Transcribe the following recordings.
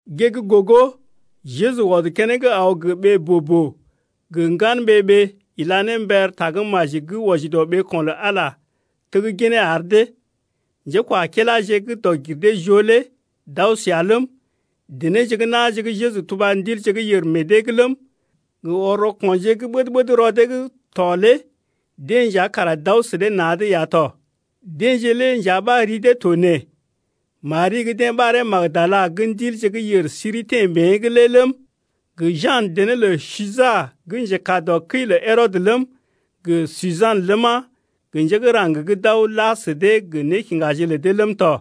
Gée’g gogo Jeju ɔd keneŋ aw gə́ ɓee boo-boo gə ŋgan ɓee-ɓee ila ne mber tagə́maji gə́ wɔji dɔ ɓeeko̰ lə Ala lé tegginee ar dee. Njékwakiláje gə́ dɔg-gir-dee-joo lé d’aw səa ləm, denéje gə́ na̰je gə́ Jeju tuba ndilje gə́ yèr meḛ dee’g ləm, gə ɔr rɔko̰je gə́ ɓəd-ɓəd rɔ dee’g tɔ lé deḛ nja kara d’aw sə dee na̰’d ya tɔ. Deḛje lé nja ɓa ri dee to nee: Mari gə́ ḭ Magdala gə́ ndilje gə́ yèr siri teḛ mée’g lé ləm, gə Jan dené lə Suja gə́ njekaa dɔ kəi lə Herɔdə ləm, gə Sujan ləma, gə njé gə́ raŋg gə́ d’aw la sə dee gə nékiŋgaje lə dee ləm tɔ.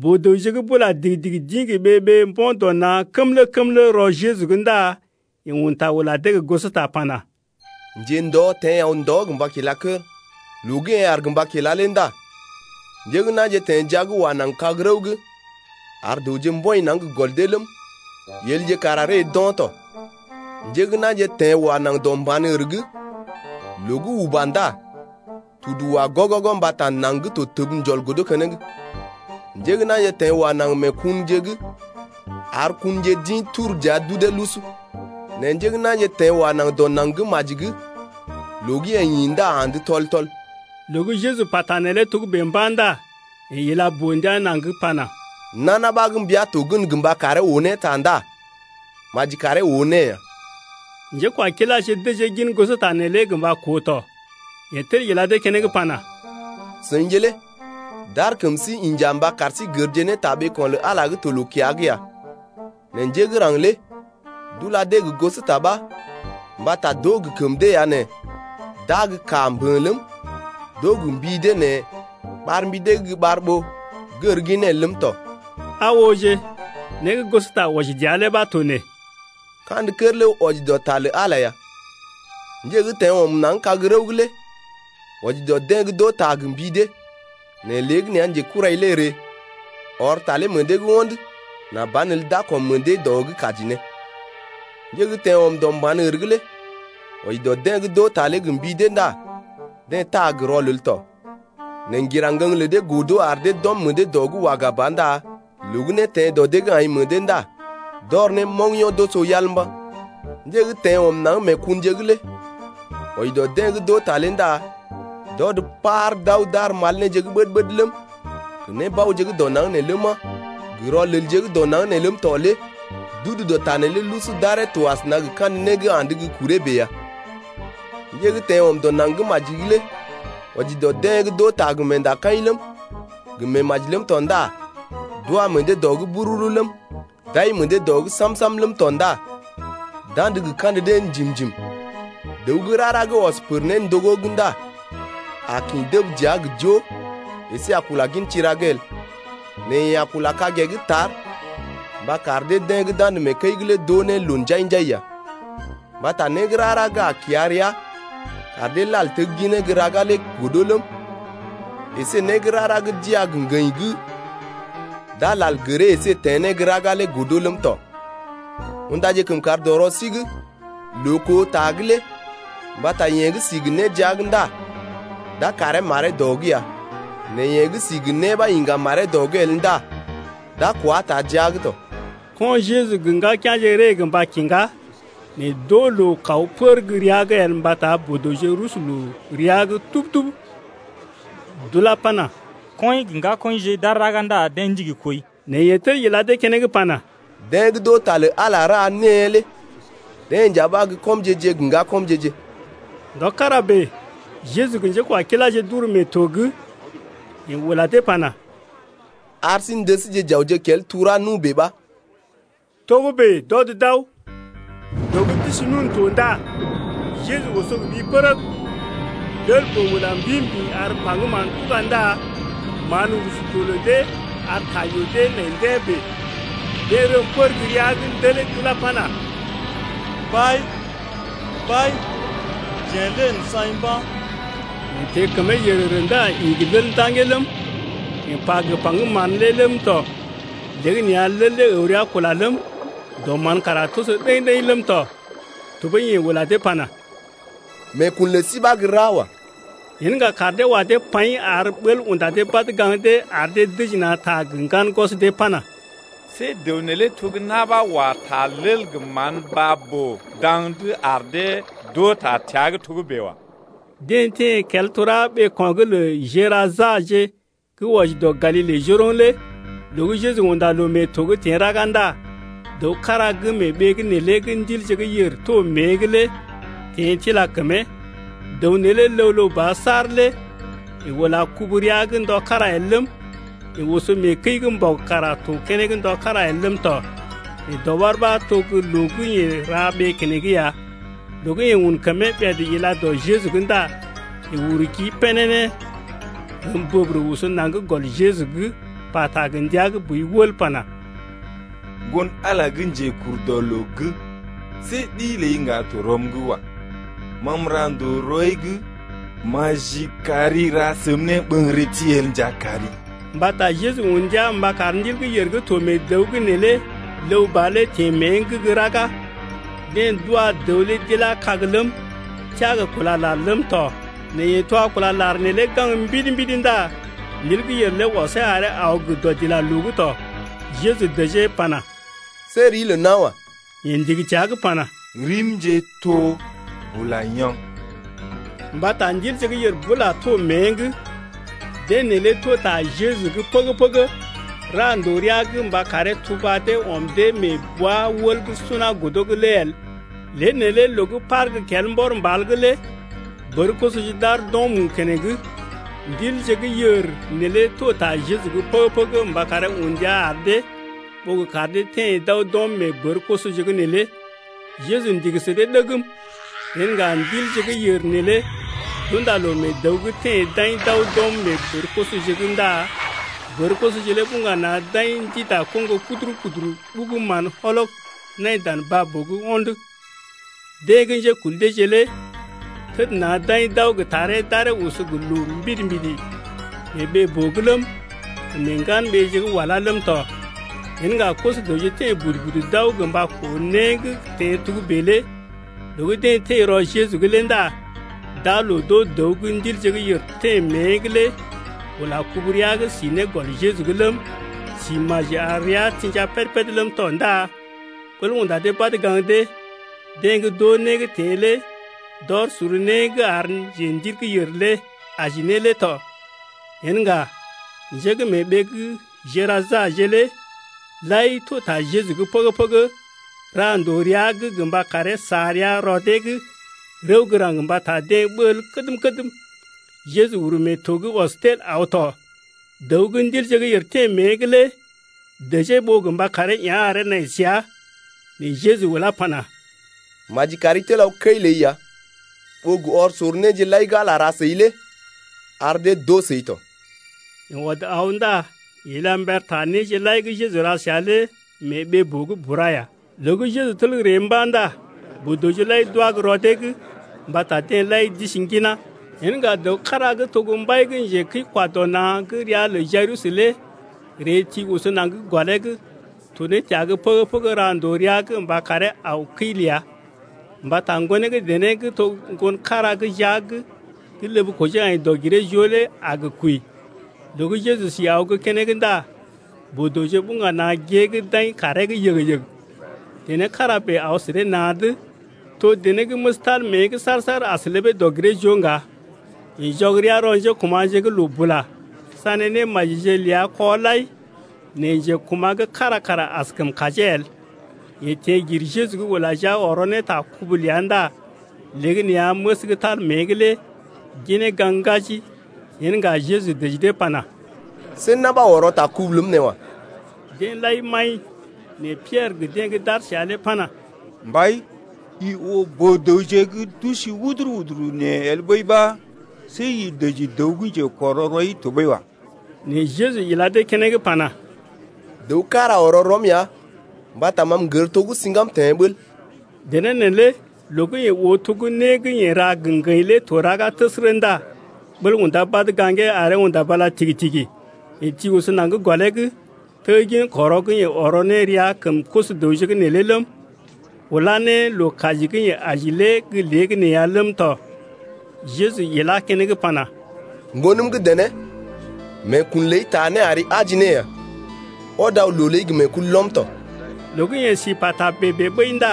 Boo-dəwje gə́ bula digi-digi d’ḭ gə ɓee-ɓee mbo̰ dɔ na̰ kəmlə-kəmlə rɔ Jeju’g ndá yeḛ un ta ula dee gə gosota pana: Njendɔ teḛ aw ndɔ gə mba kila kər. Loo gə́ yeḛ aar gə mba kila lé ndá njé gə́ na̰je teḛ jia’g wa naŋg kag-rəw’g ar dəwje mbɔḭ naŋg gə gɔl dee ləm, yelje kara ree d’o̰ tɔ. Njé gə́ na̰je teḛ wa naŋg dɔ mban-ər’g, loo gə́ uba ndá yeḛ tudu wa gɔgɔgɔ mbata naŋg gə́ to təb njɔl godo keneŋ. Njé gə́ na̰je teḛ wa naŋg mee kunje’g, ar kunje d’ḭ turu dəa d’udee lusu. Nɛ njé gə́ na̰je teḛ wa naŋg dɔ naŋg gə́ maji’g, loo gə́ yee ḭ ndá andə tɔl-tɔl. Loo gə́ Jeju pata neelé togə́bè mba̰ ndá yeḛ ila boo-ndia naŋg pana: Nana ɓa gə́ mbia to gən gə mba karee oo ne ta ndá maji karee oo ne ya. Njékwakiláje dəjee gin gosota neelé gə mba koo tɔ. Yeḛ tel ila dee keneŋ pana: Seḭje lé d’ar kəm sí inja mba kar sí gərje ne ta ɓeeko̰ lə Ala gə́ to loo-kiya’g ya. Nɛ njé gə́ raŋg lé d’ula dee gə gosota ɓa mbata d’oo gə kəm dee ya nɛ d’aa gə́ kaa mbə̰ ləm, d’oo gə mbi dee nɛ ɓar mbi dee’g gə́ ɓar ɓó gər ginee el ləm tɔ. Aa ooje, né gə́ gosota wɔji dəa lé ɓa to nee: Kandə kər lé wɔji dɔ ta lə Ala ya. Njé gə́ teḛ ɔm naŋg kag-rəw’g lé wɔji dɔ deḛ gə́ d’oo ta gə mbi dee, nɛ léegəneeya njekurai lé ree, ɔr ta lé meḛ dee’g ho̰d, nà banelə d’a kɔm meḛ dee dɔ’g kaji ne. Njé gə́ teḛ ɔm dɔ mban-ər’g lé wɔji dɔ deḛ gə́ d’oo ta lé gə mbi dee ndá deḛ taa gə rɔlel tɔ, nɛ ŋgira ŋgəŋ lə dee godo ar dee d’ɔm meḛ dee dɔ’g waga ba ndá loo gə́ né teḛ dɔ dee’g aḭ meḛ dee ndá d’ɔr ne moŋgyo̰ d’oso yal mba̰. Njé gə́ teḛ ɔm naŋg mee kunje’g lé wɔji dɔ deḛ gə́ d’oo ta lé ndá d’ɔd par d’aw d’ar mal néje gə́ ɓəd-ɓəd ləm, gə nébaoje gə́ dɔ naŋg ləma, gə rɔlelje gə́ dɔ naŋg nee ləm tɔ lé d’udu dɔ ta neelé lusu d’aree to asəna gə kandə né gə́ andə gə́ kuree bèe ya. Njé gə́ teḛ ɔm dɔ naŋg gə́ maji’g lé wɔji dɔ deḛ gə́ d’oo ta gə meendakaḭ ləm, gə meemaji ləm tɔ ndá d’wa meḛ dee dɔ’g bururu ləm, d’ai meḛ dee dɔ’g sam-sam ləm tɔ ndá d’andə gə kandə dee njim-njim. Dəw gə́ rara gə́ ɔs pər néndogó’g ndá a kḭ dəb dəa gə jo əsé a kula gin tira’g el, nɛ yeḛ a kula kagee’g tar mba kar deḛ gə́ d’andə mee kəi’g lé d’oo ne loo njai-njai ya. Mbata né gə́ rara gə́ a kiya rəa kar dee lal tegginee gə́ raga lé godo ləm, əsé né gə́ rara gə́ d iya gə ŋgəḭ gə́ d’a lal gəree əsé teḛ ne gə́ raga lé godo ləm tɔ. Undaje kəmkàr dɔ rɔ sí’g loo koo ta’g lé mbata yeḛ gə́ si gə né jia’g ndá d’a karee maree dɔ’g ya, nɛ yeḛ gə́ si gə né ɓa iŋga maree dɔ’g el ndá d’a kwá taa jia’g tɔ. Ko̰ Jejuje gə ŋgakea̰je ree gə́ mba kiŋgá, nɛ d’oo loo kaw pər gə́ rəa’g el mbata boo-dəwje rusu loo rəa’g tub-tub. D’ulá pana: Kɔḭje gə ŋgakɔḭje d’aar raga ndá deḛ ndigi kooi. Nɛ yeḛ tel ila dee keneŋ pana: Deḛ gə́ d’oo ta lə Ala ra née lé deḛ nja ɓa gə́ kɔmje-je gə ŋgakɔmje-je. Ndɔ kára bèe, Jeju gə njékwakiláje d’uru mee to’g. Yeḛ ula dee pana: Ar sí n’dəsje j’awje kel tura nu bèe ɓa. Togə́bè d’ɔd d’aw. Loo gə́ d’isi nun to ndá Jeju oso gə ɓi pərəg. Lel-boo ula mbḭ-mbḭ ar paŋgəm mán tuga ndá mán rusu to lə dee ar ta yoo dee nai ndḛ́ bèe. Deḛ rəm pər gə́ rəa’g ndelee d’ulá pana: Mbai, mbai, jeḛ lé n’saḭ mba̰. Yeḛ teḛ kəmee yərərə ndá ḭ gə lel ndaŋgee ləm, yeḛ pa gə paŋgəm mán lé ləm tɔ. Léegəneeya lel lé əw rəa kula ləm, dɔ mán kara toso ɗəḭ-ɗəḭ ləm tɔ. Tɔɓəi yeḛ ula dee pana: Meekun lə sí ɓa gə́ ra wa. Yen ŋga kaar dee wa dee paḭ ar ɓəl unda dee badə gaŋg dee ar dee dəji na̰ ta gə ŋgan gwɔs dee pana: See dəw neelé to gə na̰ ɓa wa ta lel gə mán baa-boo daŋ’d ar dee d’oo ta təa’g togə́bè wa. Deḛ teḛ kel tura ɓeeko̰ gə́ lə Gerasaje gə́ wɔji dɔ Galile njoroŋ lé. Loo gə́ Jeju unda loo mee to’g teḛ raga ndá dəw kára gə́ mee ɓee’g neelé gə́ ndilje gə́ yèr to mée’g lé teḛ tila kəmee. Dəw neelé ləw-ləw ba saar lé yeḛ ula kubu rəa’g ndɔ kára el ləm, yeḛ oso mee kəi’g mbɔg kara to keneŋ ndɔ kára el ləm tɔ, nɛ dɔɓar ɓa to gə́ loo gə́ yeḛ ra ɓee keneŋ ya. Loo gə́ yeḛ un kəmee ɓèd ila dɔ Jeju’g ndá yeḛ uru kii pénéné, rəm bəbərə oso naŋg gɔl Jeju’g, pata gə ndia gə́ boi wəl pana: Ŋgon-Ala gə́ Njekurdɔloo’g, see ɗi ləi ŋga to rɔm’g wa. Ma m’ra ndòo rɔi’g, maji kar i ra səm néɓəŋgərəti el nja kari. Mbata Jeju un ndia mba kar ndil gə́ yèr gə́ to mee dəw’g neelé ləw ba lé teḛ mée’g gə́ raga. Deḛ d’wa dəw lé d’ilá kag ləm, teá gə kúla lar ləm tɔ nɛ yeḛ twa kúla lar neelé gaŋg mbidi-mbidi ndá ndil gə́ yèr lé ɔsee aree aw gə dɔdilaloo’g tɔ. Jeju dəjee pana: See rii lə nawa. Yeḛ ndigi təa’g pana: Rim to Bula-dig. Mbata ndilje gə́ yèr bula to mée’g. Deḛ neelé to ta Jeju’g pəgə-pəgə ra ndòo rəa’g mba karee tuba dee ɔm dee mee bwa-wəl gə́ suna godo’g lé el. Lée neelé loo gə́ par gə́ kel mbɔr mbal’g lé bər-kosoje d’aar d’o̰ mu keneŋ. Ndilje gə́ yèr neelé to ta Jeju’g pəgə-pəgə mba karee un ndia ar dee, ɓó gə kar dee teḛ d’aw d’ɔm mee bər-kosoje’g neelé. Jeju ndigi sə dee ɗegm. Yen ŋga ndilje gə́ yèr neelé d’unda loo mee dəw’g teḛ d’aḭ d’aw d’ɔm mee bər-kosoje’g ndá bər-kosoje lé buŋga na̰ d’aḭ ndida koŋgo puduru-puduru ɓugu mán wɔlɔg nai dan baa-boo’g ho̰d. Deḛ gə́ njékul deeje lé təd na̰ d’aḭ d’aw gə taree d’aree oso gə loo mbidi-mbidi mee ɓee-boo’g ləm, gə mee ŋgan-ɓeeje gə́ walá ləm tɔ. Yen ŋga koso-dəwje teḛ budu-budu d’aw gə mba koo né gə́ teḛ togə́bè lé. Loo gə́ deḛ teḛ rɔ Jeju’g lé ndá d’aa loo d’oo dəw gə́ ndilje gə́ yèr teḛ mée’g lé ula kubu rəa’g si ne gɔl Jeju’g ləm, si maji ar rəa tḭja péd-péd ləm tɔ ndá ɓəl unda dee badə gaŋg dee. Deḛ gə́ d’oo né gə́ teḛ lé d’ɔr sor né gə́ ar njendil gə́ yèr lé aji ne lé tɔ. Yen ŋga njé gə́ mee ɓee gə́ Gerasaje lé lai to ta Jeju’g pəgə-pəgə, ra ndòo rəa’g gə mba karee sa rəa rɔ dee’g rəw gə́ raŋg mbata deḛ ɓəl kədm-kədm. Jeju uru mee to’g ɔs tel aw tɔ. Dəw gə́ ndilje gə́ yèr teḛ mée’g lé dəjee ɓó gə mba karee yá̰ aree nai səa. Nɛ Jeju ulá pana, Maji kari tel aw kəi ləi ya, ɓó gə́ ɔr sor néje lai gə́ Ala ra səi lé ar dee d’oo səi tɔ. Yeḛ ɔd aw ndá yeḛ ila mber ta néje lai gə́ Jeju ra səa lé mee ɓee-boo’g bura ya. Loo gə́ Jeju tel ree mba̰ ndá boo-dəwje lai d’wá gə́ rɔ dee’g mbata deḛ lai d’isi ŋginá. Yen ŋga dəw kára gə́ to gə́ mbai gə́ njekəi-kwa-dɔ-na̰ gə́ ria lə Jayirus lé ree ti oso naŋg gɔlee’g to ne təa’g pəgə-pəgə ra ndòo rəa’g mba karee aw kəi ləa, mbata ŋgonee gə́ dené gə́ to ŋgon kára gə́ jia’g gə́ ləb kojee aḭ dɔg-giree-joo lé a gə kwəi. Loo gə́ Jeju si aw gə́ keneŋ ndá boo-dəwje buŋga na̰ gée’g d’aḭ kaaree’g yəg-yəg. Dené kára bèe aw sə dee na̰’d, to dené gə́ məs tal rəa’g saar-saar as ləbee dɔg-giree-joo ŋga. Yeḛ jɔg rəa rɔ njékuma̰je’g loo bula, sané némajije ləa kɔ lai, nɛ njekuma̰ gə́ kára kara askəm kajee el. Yeḛ teḛ gir Jeju’g ula jia ɔrɔ ne ta kubu ləa ndá léegəneeya məs gə́ tal rəa’g lé ginee gaŋg ŋgaji. Yen ŋga Jeju dəji dee pana: See na̰ ɓa ɔrɔ ta kubu ləm nee wa. Deḛ lai maḭ, nɛ Piɛrə gə deḛ gə́ d’aar səa lé pana: Mbai, i oo boo-dəwje gə́ d’usi wuduru-wuduru nee el ɓəi ɓa see i dəji dəw gə́ njekɔrɔ rɔi tɔɓəi wa. Nɛ Jeju ila dee keneŋ pana: Dəw kára ɔrɔ rɔm ya mbata ma m’gər to gə́ siŋgam teḛ ɓəl. Dené neelé loo gə́ yeḛ oo to gə́ né gə́ yeḛ ra gə ŋgəḭ lé to raga təsərə ndá ɓəl undá badə gaŋgee aree unda bala tigi-tigi. Yeḛ ti oso naŋg gɔlee’g, teggin kɔrɔ gə́ yeḛ ɔrɔ ne rəa kəm koso-dəwje’g neelé ləm, ulá ne loo kaji gə́ yeḛ aji lé gə́ léegəneeya ləm tɔ. Jeju ilá keneŋ pana: Ŋgonəm gə́ dené, meekun ləi taa né ari aji ne ya. Ɔd aw loo ləi gə meekulɔm tɔ. Loo gə́ yeḛ si pata bèe-bèe ɓəi ndá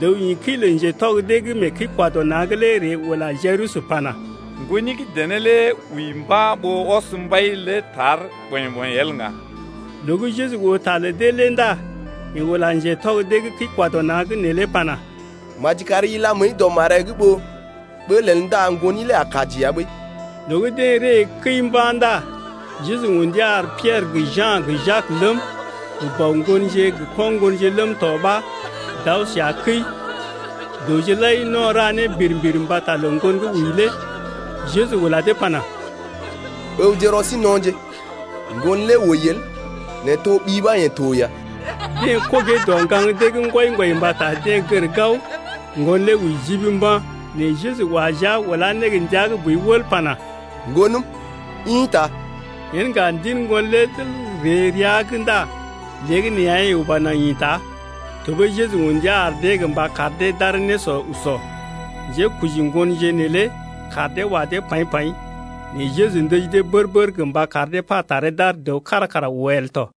dəw ḭ kəi lə ŋgatɔg gə́ mee kəi-kwa-dɔ-na̰’g lé ree ula Jayirus pana: Ŋgoni gə́ dené lé wəi mba̰ ɓó ɔs mbai lé tar ɓɔḭ-ɓɔḭ el ŋga. Loo gə́ Jeju oo ta lə dee lé ndá yeḛ ula ŋgatɔg dee gə́ kəi-kwa-dɔ-na̰’g neelé pana: Maji kari ila məəi dɔ maree’g ɓó ɓəl el ndá ŋgoni lé a kaji ya ɓəi. Loo gə́ deḛ ree kəi mba̰ ndá Jeju un ndia ar Piɛrə gə Ja̰ gə Jak ləm, gə bɔ ŋgonje gə ko̰ ŋgonje ləm tɔ ɓa d’aw səa kəi. Dəwje lai no̰ ra né birim-birim mbata lə ŋgon gə́ wəi lé. Jeju ula dee pana: Ǝwje rɔ sí no̰je, ŋgon lé wəi el, nɛ toɓi ɓa yeḛ to ya. Deḛ kogee dɔ ŋgaŋ dee’g ŋgwɔi-ŋgwɔi mbata deḛ gər gao ŋgon lé wəi jib mba̰. Nɛ Jeju wa jia ulá ne gə́ ndia gə́ boi wəl pana: Ŋgonəm ḭta. Yen ŋga ndil ŋgon lé tel ree rəa’g ndá léegəneeya yeḛ uba naŋg ḭta. Tɔɓəi Jeju un ndia ar dee gə mba kar dee d’aree nésɔ usɔ. Njékoji ŋgonje neelé kaar dee wa dee paḭ-paḭ, nɛ Jeju ndəji dee bər-bər gə mba kar dee pa taree d’ar dəw kára kara oo el tɔ.